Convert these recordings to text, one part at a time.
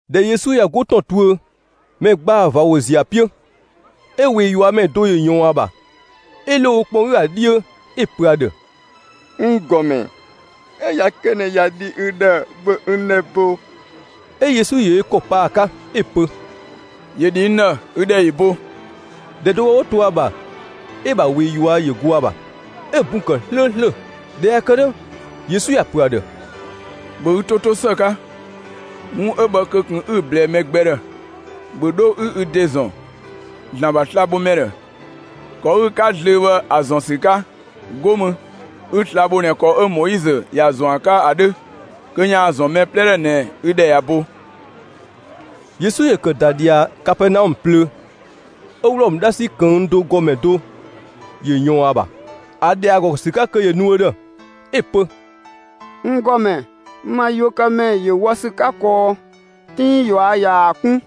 ꞊Dhɛ Yesu ꞊ya 'go ‑tɔn tuö, mɛ ‑gbaa ꞊va ‑wo ‑ziö ‑a 'piö. 'Ö ꞊wee ꞊yuamɛ do ‑yö ꞊yɔɔn ‑a ‑bha, 'ö ‑lo ö kpɔn 'gü ‑a 'dhiö 'ö‑ pö ‑a ‑dhë: «N ‑Gɔmɛ, 'ö ꞊ya kë ꞊nɛ ꞊ya dhi ü ‑dhë, ‑bhö n ‑dhɛ bo!» 'Ö Yesu ‑yö ö ‑kɔ pa ‑a 'ka, 'ö‑ pö: «‑Yö ‑dhi n ‑dhë; ü ‑dhɛ ‑yö bo!» ‑Dhɛ do bhë 'wo to ‑a ‑bha, 'ö‑ ‑bha ꞊wee ꞊yua' ‑yö go ‑a ‑bha, 'ö‑ bun ‑kë 'slööslö. ꞊Dhɛ ꞊ya kë 'dhö, Yesu ‑ya ‑pö ‑a ‑dhë: «‑Bhö ü 'to 'to ‑së 'ka, 'wun 'ö bhë kö ꞊kun 'ü‑ ꞊blɛɛ mɛ gbɛ ‑dhë! ‑Bhö 'dho 'ü ü ‑de ‑zɔn ‑Zlan ‑bha slabhomɛ ‑dhë, ‑kɔ 'ü‑ 'ka zlöö bhë ‑a ‑zɔn ‑sü 'ka! 'Go mü, 'ü sla‑ bho ꞊nɛ ‑kɔ 'ö Moizö ‑ya ‑zɔn ‑a 'ka ‑a 'dhö, kö ‑yaan ‑zɔn mɛ 'plɛ ‑dhë ꞊nɛ ü ‑dhɛ ꞊ya bo!» Yesu ‑yö ‑kë ‑da ꞊dhia Kapɛɛnaɔmë plöö, 'ö Wlɔmë 'dhasi ꞊këng' do ‑gɔmɛ do ‑yö ‑yɔɔn ‑a ‑bha, ‑a ‑dhɛ ‑a ‑gɔ ‑sü 'ka kö ‑yö nu ö ‑dhë, 'Ö‑ pö: «N ‑Gɔmɛ, n bha yuökëmɛ ‑yö wɔ ‑sü 'ka kɔɔ, 'tinng ꞊yua' ꞊yaa‑ 'kun,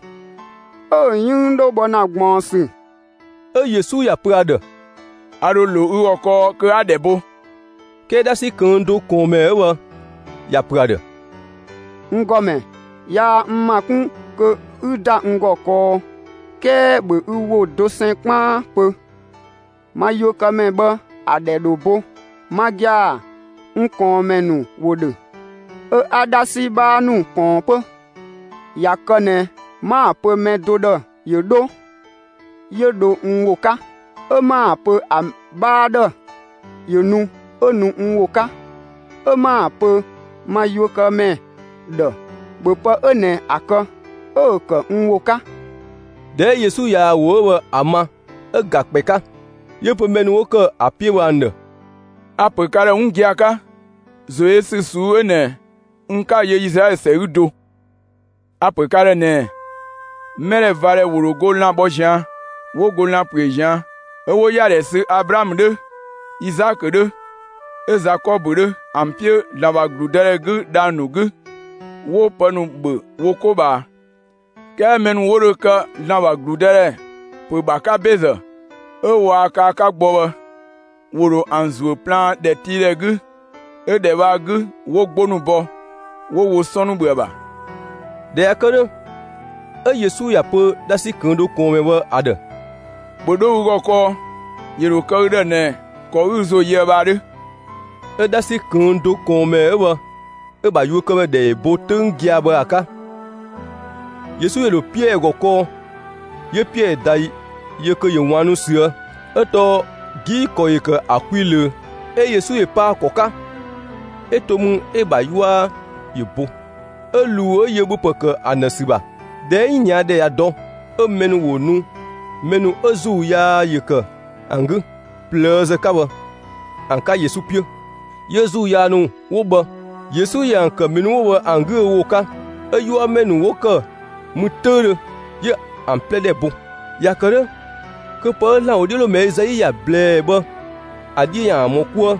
'ö‑ 'yënng 'dhö bhɔ ‑na ꞊gbaɔnsü.» 'Ö Yesu ‑ya pö ‑a ‑dhë: «A ‑dho ‑lo ü ‑gɔ kɔɔ kö 'a‑ 'dhɛ bo.» 'Kɛɛ 'dhasi ꞊këng' do ꞊kɔɔnmɛ 'ö bhë ‑ya ‑pö ‑a ‑dhë: «N ‑Gɔmɛ, yaa n ‑ma 'kun kö 'ü ‑da n ‑gɔ kɔɔ, 'kɛɛ ‑bhö ü ‑wo dosɛn 'kpaan pö, ma yuökëmɛ bhë ‑a ‑dhɛ ‑dho bo. Ma gia‑, n ꞊kɔɔnmɛ ‑nu ‑wo ‑dhö, 'ö 'a 'dhasi 'bhaa ‑nu ꞊kɔɔn 'pö. ꞊Ya kë ꞊nɛ 'ma‑ pö mɛ do ‑dhë ‑yö 'dho, 'yö dho n ‑wo 'ka; 'ö 'ma‑ pö ‑a 'bhaa ‑dhë ‑yö nu, 'ö nu n ‑wo 'ka, 'ö 'ma‑ pö ma yuökëmɛ ‑dhë: ‹‑Bhö pë 'ö ꞊nɛ ‑a kë!› 'Ö‑ kë n ‑wo 'ka.» ꞊Dhɛ 'ö Yesu ꞊yaa‑ ‑wo 'ö bhë ‑a ma, 'ö‑ ‑ga ‑kpɛ 'ka, 'yö‑ pö mɛ ‑nu 'wo ‑kë ‑a 'piö bhë ‑an ‑dhë: «A‑ ‑pö ka ‑dhë 'wun gia‑ 'ka, ‑zoyösü ꞊suu'‑ 'ö ꞊nɛ, n 'ka‑ yö Izlaɛlö ‑sɛ 'gü do. A‑ ‑pö ka ‑dhë ꞊nɛɛ: Mɛdhɛvadhɛ ‑wo ‑dho go lan‑ bhɔ ꞊zian', 'wo go lan‑ ‑püö ꞊zian', 'ö 'wo ‑yadhɛ sü Ablaamö 'dhö, Izaakö 'dhö, 'ö Zakɔbö 'dhö ‑an 'piö ‑Zlan ‑bha ‑gludëdhɛ 'gü dhang‑ ‑nu 'gü, 'wo pë ‑nu ‑bhö wo 'ko ꞊bhaa. 'Kɛɛ mɛ ‑nu 'wo dho kë ‑Zlan ‑bha ‑gludëdhɛ ‑pö ‑bha 'ka ‑bezë, 'ö waa kë ‑a 'ka gbɔ bhë, ‑wo ‑dho ‑an ‑zuö plaan ‑dhɛtiidhɛ 'gü, 'ö ‑dhɛ bhë ‑a 'gü 'wo 'gbo ‑nu bɔ, 'wo wo 'sɔn ‑nu ‑bhö ‑a ‑bha.» ꞊Dhɛ ꞊ya kë 'dhö, 'ö Yesu ‑ya pö 'dhasi ꞊këng' do ꞊kɔɔnmɛ bhë ‑a ‑dhë: «‑Bhö 'dho ü ‑gɔ kɔɔ, ‑yö ‑dho kë ü ‑dhë ꞊nɛ ‑kɔ 'ü ü ‑zo yöë bhë ‑a 'dhö!» 'Ö 'dhasi ꞊këng' do ꞊kɔɔnmɛ 'ö bhë 'ö‑ ‑bha yuökëmɛ ‑dhɛ ‑yö bo 'töng gia‑ bhë ‑a 'ka. Yesu ‑yö ‑dho Piɛɛ ‑gɔ kɔɔ; 'yö Piɛɛ ꞊da yö kö ‑yö ꞊waannu ꞊süë', 'ö tɔɔ 'gii‑ ‑kɔ ‑yö ‑kë ‑a kwi ꞊löö. 'Ö Yesu ‑yö pa ‑a ‑kɔ 'ka, 'ö to mü 'ö‑ ‑bha 'yua ‑yö bo 'ö ꞊luu 'ö yö ‑bhöpë ‑kë ‑an ‑dhë ‑sü ‑bha. ꞊Dhɛ 'ö 'yinia ‑dhɛ ꞊ya dɔ, 'ö mɛ ‑nu ‑wo nu, mɛ 'ö ‑zuu yaa ‑yö ‑kë ‑an 'gü ꞊plëëzë 'ka bhë ‑an 'ka Yesu 'piö. 'Yö ‑zuu yaa ‑nu 'wo bhë, Yesu ‑yö ‑an ‑kë mɛ ‑nu 'wo bhë ‑an 'gü ö ‑wo 'ka; 'ö 'yuamɛ ‑nu 'wo ‑kë mü 'töüdhö, 'yö ‑an 'plɛ ‑dhɛ bo. ‑Ya ‑kë 'dhö, kö pë 'ö ‑Zlan ‑wodhiölomɛ Ezai ‑ya ꞊blɛɛ bhë, ‑a 'dhiö ‑yaan ‑mɔ 'kuë.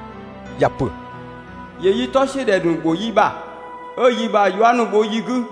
‑Ya ‑pö: ‑Yö yi 'tɔ ‑siö ‑dhɛ ‑nu ‑bho yi ‑bha, 'ö yi ‑bha 'yua ‑nu bho yi 'gü.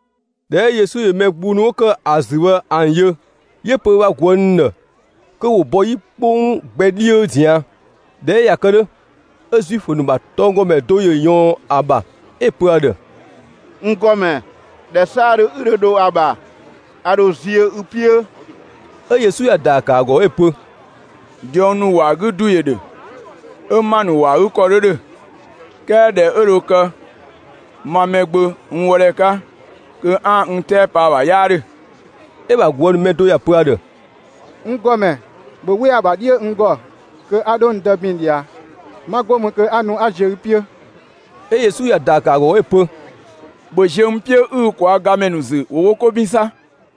꞊Dhɛ 'ö Yesu ‑yö mɛ gbung ‑nu 'wo ‑kë ‑a ‑zü bhë ‑an yö, 'yö‑ pö ö ‑bha ꞊guë' ‑nu ‑dhë kö ‑wo bɔ 'yi 'kpong gbɛ 'dhiö ꞊zian'. ꞊Dhɛ 'ö ꞊ya kë 'dhö, 'ö Zuifö ‑nu ‑bha tɔnggɔmɛ do ‑yö ꞊yɔɔn ‑a ‑bha 'ö‑ pö ‑a ‑dhë: «N ‑Gɔmɛ, ‑dhɛ 'saadhö 'ü dhö dho ‑a ‑bha, a ‑dho ziö ü 'piö.» 'Ö Yesu ‑ya ‑daa ‑kë ‑a ‑gɔ 'ö‑ pö: «Diɔng ‑nu ‑wɔ ‑a 'gü ‑du ‑yö ‑dhö, 'ö ‑ma ‑nu ‑wɔ ‑a 'gü ‑kɔ 'dhö ‑dhö, 'kɛɛ ‑dhɛ 'ö dho kë ma Mɛgbö n wɔ ‑dhɛ 'ka, kö 'aan‑ n 'tɛɛ pa ‑a ‑bha 'yaa ‑dhö.» 'Ö‑ ‑bha ꞊guë' ‑nu mɛ do ‑ya pö ‑a ‑dhë: «N ‑Gɔmɛ, ‑bhö 'we ‑a ‑bha 'dhiö n ‑gɔ, kö 'a 'dho n dë ‑bin ꞊dhia. 'Ma 'go mü kö 'a nu 'a ziö ü 'piö.» 'Ö Yesu ‑ya ‑daa ‑kë ‑a ‑gɔ 'ö‑ pö: «‑Bhö ziö n 'piö 'ü ü ꞊kwaa' gamɛ ‑nu ‑zü, ‑wo wo 'ko ‑bin 'sa!»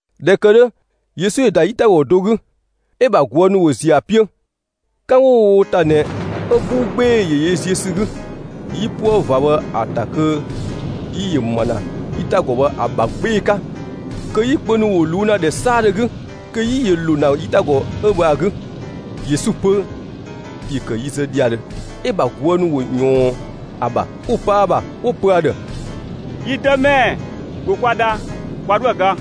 ꞊Dhɛ ‑kë 'dhö, Yesu ‑yö ‑da 'yitagɔ do 'gü, 'ö‑ ‑bha ꞊guë' ‑nu ‑wo ‑ziö ‑a 'piö. 'Kan 'wo‑ wo wo ‑ta ꞊nɛ, 'ö 'buu 'gbee‑ ‑yö yö ziö ‑sü 'gü, 'yipuë ꞊va bhë ‑a ‑ta kö 'yi ‑yö ‑ma ‑na 'yitagɔ bhë ‑a ‑bha 'gbee‑ 'ka, kö 'yi kpö ‑nu ‑wo ꞊luu' ‑na ‑dhɛ 'saadhö 'gü, kö 'yi ‑yö ‑lo ‑na 'yitagɔ 'ö bhë ‑a 'gü. Yesu 'pö, ‑yö ‑kë yi zë ‑dhiadhö. 'Ö‑ ‑bha ꞊guë' ‑nu ‑wo ꞊yɔɔn ‑a ‑bha, 'wo pa ‑a ‑bha, 'wo‑ pö ‑a ‑dhë: «Yi Dëmɛ, ‑bhö kwa dha, kwa 'dhoë‑ ga!»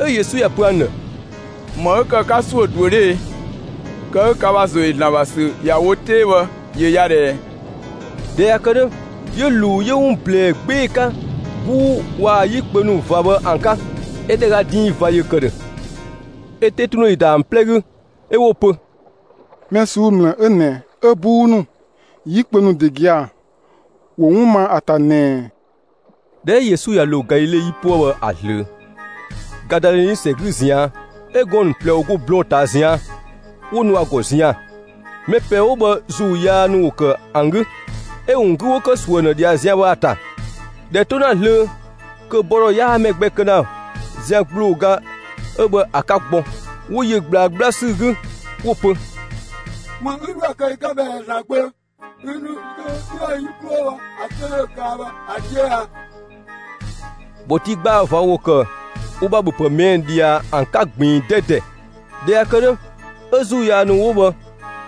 'Ö Yesu ‑ya pö ‑an ‑dhë: «‑Më 'ö ‑kë 'ka ‑suö ꞊duö 'dhö e? Kë 'ö ka ‑bha ‑zo ‑yö ‑Zlan ‑bha ‑sü ‑ya wo 'tee bhë, ‑yö ya ꞊dhɛɛ!» ꞊Dhɛ ꞊ya kë 'dhö, 'yö ꞊luu 'yö 'wun ꞊blɛɛ 'gbee‑ 'ka 'buu waa‑ 'yi kpö ‑nu ꞊va bhë ‑an 'ka, 'ö ‑dhɛ ‑ga diin ꞊va ‑yö ‑kë ‑dhö. 'Ö 'tetundhe ‑yö ‑da ‑an 'plɛ 'gü, 'ö 'wo‑ pö: «Mɛ ꞊suu'‑ ‑mlë 'ö ꞊nɛ 'ö 'buu ‑nu, 'yi kpö ‑nu ‑de gia‑, ‑wo 'wun ma ‑a ‑ta ꞊nɛɛ ꞊ɛ?» ꞊Dhɛ 'ö Yesu ꞊ya ‑lo Galile 'yipuë bhë ‑a zlöö, Gadaleni ‑sɛ 'gü ꞊zian', 'ö gɔɔn‑ ‑nu ꞊plɛ ‑wo ‑go blɔɔn‑ ꞊taa ꞊zian', 'wo nu ‑a ‑gɔ zian‑. Mɛ ꞊plɛ 'wo bhë ‑zuu yaa ‑nu ‑wo ‑kë ‑an 'gü; 'ö‑ ‑wun 'gü ‑wo ‑kë ‑suö ‑an ‑dhë ꞊dhia zian bhë ‑a ‑ta; ‑dhɛ 'to ‑na zlöö, kö bɔ ‑dhɔ 'yaa mɛ gbɛ kë ‑na zian ‑gblooga 'ö bhë ‑a 'ka gbɔ; 'wo yö ꞊gblaa 'gbla ‑sü 'gü 'wo‑ pö: «‑Më 'ü 'dhoë‑ kë yi 'ka bhë ꞊ɛ, ‑Zlan Gbö, ü ‑nu zö kö 'üën‑ yi 'klo bhɔ ‑a 'töng 'yö dho kaa bhë ‑a 'dhiö a?» ‑Bhɔtii ‑gbaa ꞊va ‑wo ‑kë wo ‑bha ‑bhöpë ꞊mɛɛ' ꞊dhia ‑an 'ka ꞊gbiin 'dɛdɛ 'ka. ꞊Dhɛ ‑ya ‑kë 'dhö, 'ö ‑zuu yaa ‑nu 'wo bhë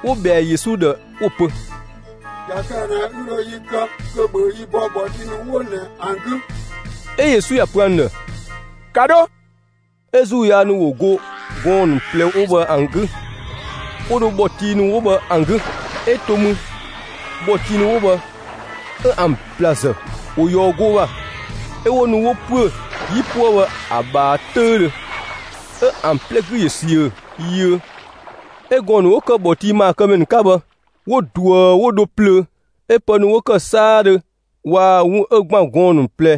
‑wo ꞊bhɛa Yesu ‑dhë 'wo‑ pö: «꞊Ya kë ꞊nɛ ü ‑dho yi kë, kö ‑bhö yi bɔ ‑bhɔtii ‑nu 'wo ꞊nɛ ‑an 'gü!» 'Ö Yesu ‑ya pö ‑an ‑dhë: «‑Ka 'dho!» 'Ö ‑zuu yaa ‑nu ‑wo go gɔɔn‑ ‑nu ꞊plɛ 'wo bhë ‑an 'gü, 'wo dho ‑bhɔtii ‑nu 'wo bhë ‑an 'gü. 'Ö to mü, ‑bhɔtii ‑nu 'wo bhë 'ö ‑an ‑blazë, ‑wo ꞊yɔɔ goo ‑bha, 'ö 'wo nu 'wo ‑püö 'yipuë bhë ‑a ꞊bhaa 'töüdhö, 'ö ‑an 'plɛ 'gü ‑yö ‑siö yiö. 'Ö gɔɔn‑ ‑nu 'wo ‑kë ‑bhɔtii ‑maakëmɛ ‑nu 'ka bhë, 'wo ꞊duë 'wo dho plöö, 'ö pë ‑nu 'wo kë 'saadhö waa‑ 'wun 'ö ‑gban gɔɔn‑ ‑nu ꞊plɛ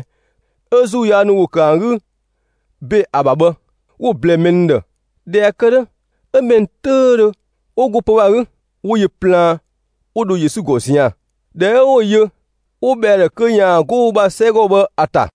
'ö ‑zuu yaa ‑nu ‑wo ‑kë ‑an 'gü ‑be ‑a ‑bha bhë, 'wo‑ ꞊blɛɛ mɛ ‑nu ‑dhë. ꞊Dhɛ ꞊ya kë 'dhö, 'ö mɛ ‑nu 'töüdhö 'wo go pö‑ bhë ‑a 'gü, 'wo yö plaan, 'wo dho Yesu ‑gɔ zian‑. ꞊Dhɛ 'ö 'wo‑ yö, 'wo ꞊bhɛa ‑a ‑dhë kö ‑yaan 'go wo ‑bha 'sɛgɔ bhë ‑a ‑ta.